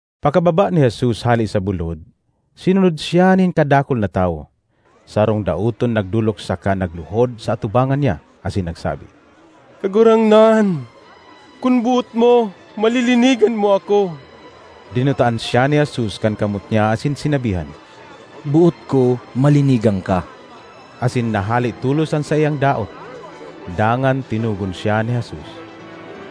Pakababa ni Jesus hale sa bulod, sinunod siya nin kadakul na tawo. Sarong daoton nagdolok saka nagluhod sa atubangan niya, asin nagsabi, “Kagurangnan, kun boot mo, malilinigan mo ako.” Dinutaan siya ni Jesus kan kamot niya asin sinabihan, “Boot ko; malinigan ka!” Asin nahale tolos an saiyang daot. Dangan tinugon siya ni Jesus,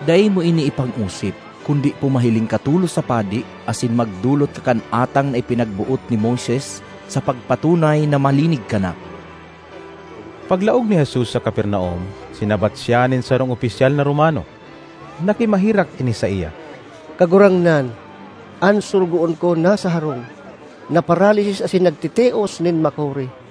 “Dai mo ini ipang-osip, kundi pumahiling ka tolos sa padi, asin magdolot ka kan atang na ipinagboot ni Moises sa pagpatunay na malinig ka na.” Paglaog ni Jesus sa Capernaum, sinabat siya nin sarong opisyal na Romano. Nakimaherak ini saiya, ”Kagurangnan, an sorogoon ko nasa harong, naparalisis asin nagtitios nin makuri.”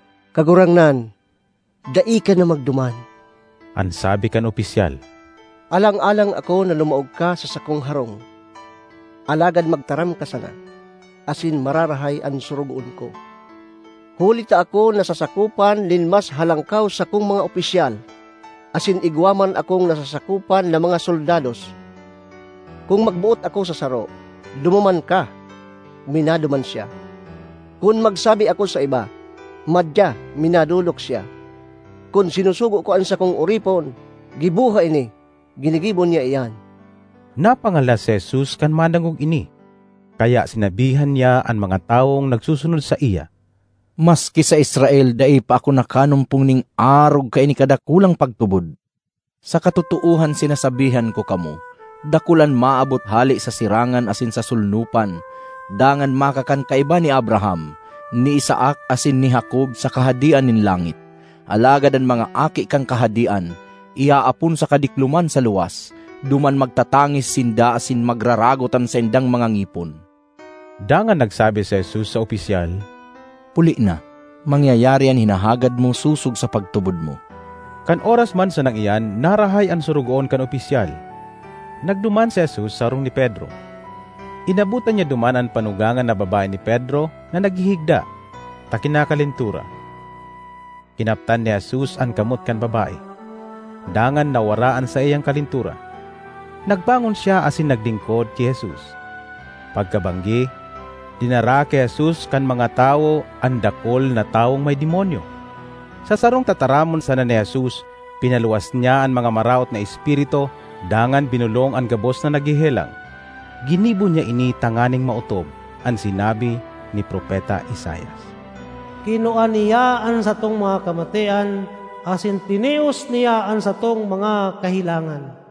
”Kagurangnan, dai ka na magduman,” an sabi kan opisyal. “Alang-alang ako na lumaog ka sa sakong harong. Alagad magtaram ka sana, asin mararahay an sorogoon ko. Huli ta ako nasasakopan nin mas halangkaw sakong mga opisyal; asin igwa man akong nasasakopan na mga soldados. Kun magboot ako sa saro, ‘Dumuman ka!’ minaduman siya; kun magsabi ako sa iba, ‘Madya!’ minadolok siya. Kun sinusugo ko an sakong oripon, ‘Giboha ini!’ ginigibo niya iyan.” Napangalas si Jesus kan madangog ini. Kaya sinabihan niya an mga tawong nagsusunod saiya, “Maski sa Israel dai pa ako nakanumpong nin arog kaini kadakulang pagtubod! Sa katotoohan sinasabihan ko kamo, dakul an maabot hale sa sirangan asin sa solnopan; dangan makakan kaiba ni Abraham, ni Isaac asin ni Jacob sa Kahadean nin langit. Alagad an mga aki kan Kahadean, iaapon sa kadikloman sa luwas; duman magtatangis sinda asin magraragot an saindang mga ngipon.” Dangan nagsabi si Jesus sa opisyal, “Puli na; mangyayari an hinahagad mo sosog sa pagtubod mo.” Kan oras man sanang iyan narahay an sorogoon kan opisyal. Nagduman si Jesus sa harong ni Pedro. Inabotan niya duman an panugangan na babae ni Pedro na naghihigda, ta kinakalentura. Kinaptan ni Jesus an kamot kan babae, dangan nawara an saiyang kalentura. Nagbangon siya asin naglingkod ki Jesus. Pagkabanggi, dinara ki Jesus kan mga tawo an dakul na tawong may demonyo. Sa sarong tataramon sana ni Jesus pinaluwas niya an mga maraot na espiritu dangan binolong an gabos na naghehelang. Ginibo niya ini tanganing maotob an sinabi ni Propeta Isaias, “Kinua niya an satong mga kamatean, asin tinios niya an satong mga kahelangan.”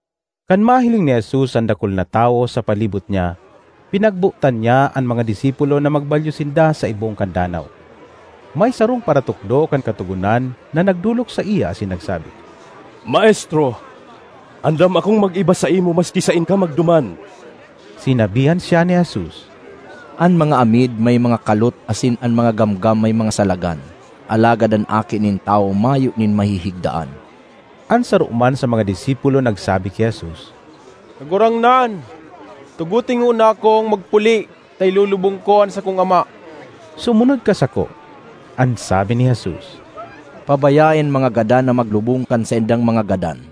Kan mahiling ni Jesus an dakul na tawo sa palibot niya, pinagbotan niya an mga disipulo na magbalyo sinda sa ibong kan danaw. May sarong paratukdo kan Katogonan na nagdolok saiya asin nagsabi, “Maestro, andam akong mag-iba saimo maski saen ka magduman.” Sinabihan siya ni Jesus, “An mga amid may mga kalot asin an mga gamgam may mga salagan, alagad an Aki nin Tawo mayo nin mahihigdaan.” An saro man sa mga disipulo nagsabi ki Jesus, “Kagurangnan, tugote ngona akong magpuli ta ilulubong ko an sakong ama.” ”Sumunod ka sako,” an sabi ni Jesus, “pabayae an mga gadan na maglubong kan saindang mga gadan.”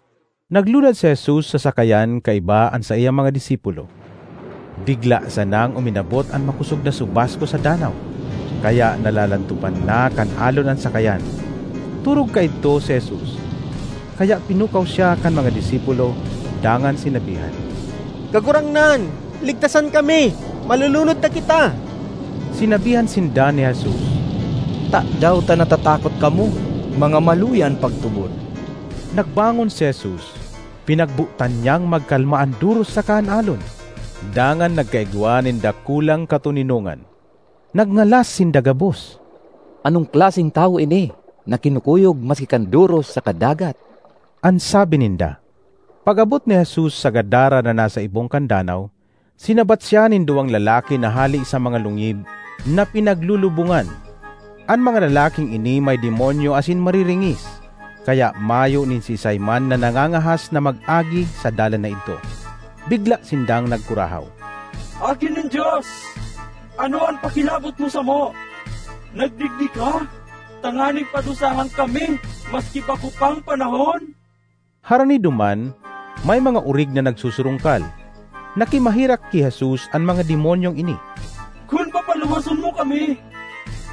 Naglunad si Jesus sa sakayan kaiba an saiyang mga disipulo. Bigla sanang uminabot an makosog na subasko sa danaw, kaya nalalantopan na kan alon an sakayan. Torog kaidto si Jesus. Kaya pinukaw siya kan mga disipulo dangan sinabihan, “Kagurangnan, ligtasan kami! Malulunod na kita!” Sinabihan sinda ni Jesus, “Tadaw ta natatakot kamo? Mga maluya an pagtubod!” Nagbangon si Jesus, pinagbotan niyang magkalma an doros saka an alon, dangan nagkaigwa nin dakulang katoninongan. Nagngalas sinda gabos. “Anong klaseng tawo ini na kinukuyog maski kan doros saka dagat?” an sabi ninda. Pag-abot ni Jesus sa Gadara na nasa ibong kan danaw, sinabat siya nin duwang lalaki na hale sa mga lungib na pinaglulubongan. An mga lalaking ini may demonyo asin mariringis, kaya mayo nin siisay man na nangangahas na mag-agi sa dalan na idto. Bigla sindang nagkurahaw, “Aki nin Dios, ano an pakilabot mo samo? Nagdigdi ka tanganing padusahan kami maski bako pang panahon?” Harani duman, may mga orig na nagsusurungkal. Nakimaherak ki Jesus an mga demonyong ini, “Kun papaluwason mo kami,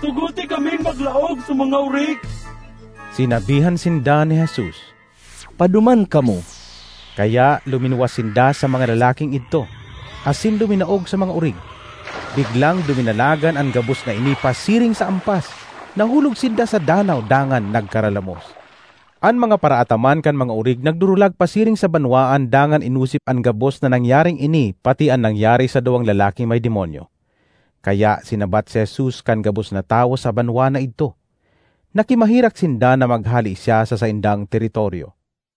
tugote kaming maglaog sa mga orig.” Sinabihan sinda ni Jesus, “Paduman kamo.” Kaya luminuwas sinda sa mga lalaking idto asin luminaog sa mga orig. Biglang duminalagan an gabos na ini pasiring sa ampas; nahulog sinda sa danaw dangan nagkaralamos. An mga paraataman kan mga orig nagdurulag pasiring sa banwaan dangan inosip an gabos na nangyaring ini pati an nangyari sa duwang lalaking may demonyo. Kaya sinabat si Jesus kan gabos na tawo sa banwaan na idto. Nakimaherak sinda na maghale siya sa saindang teritoryo.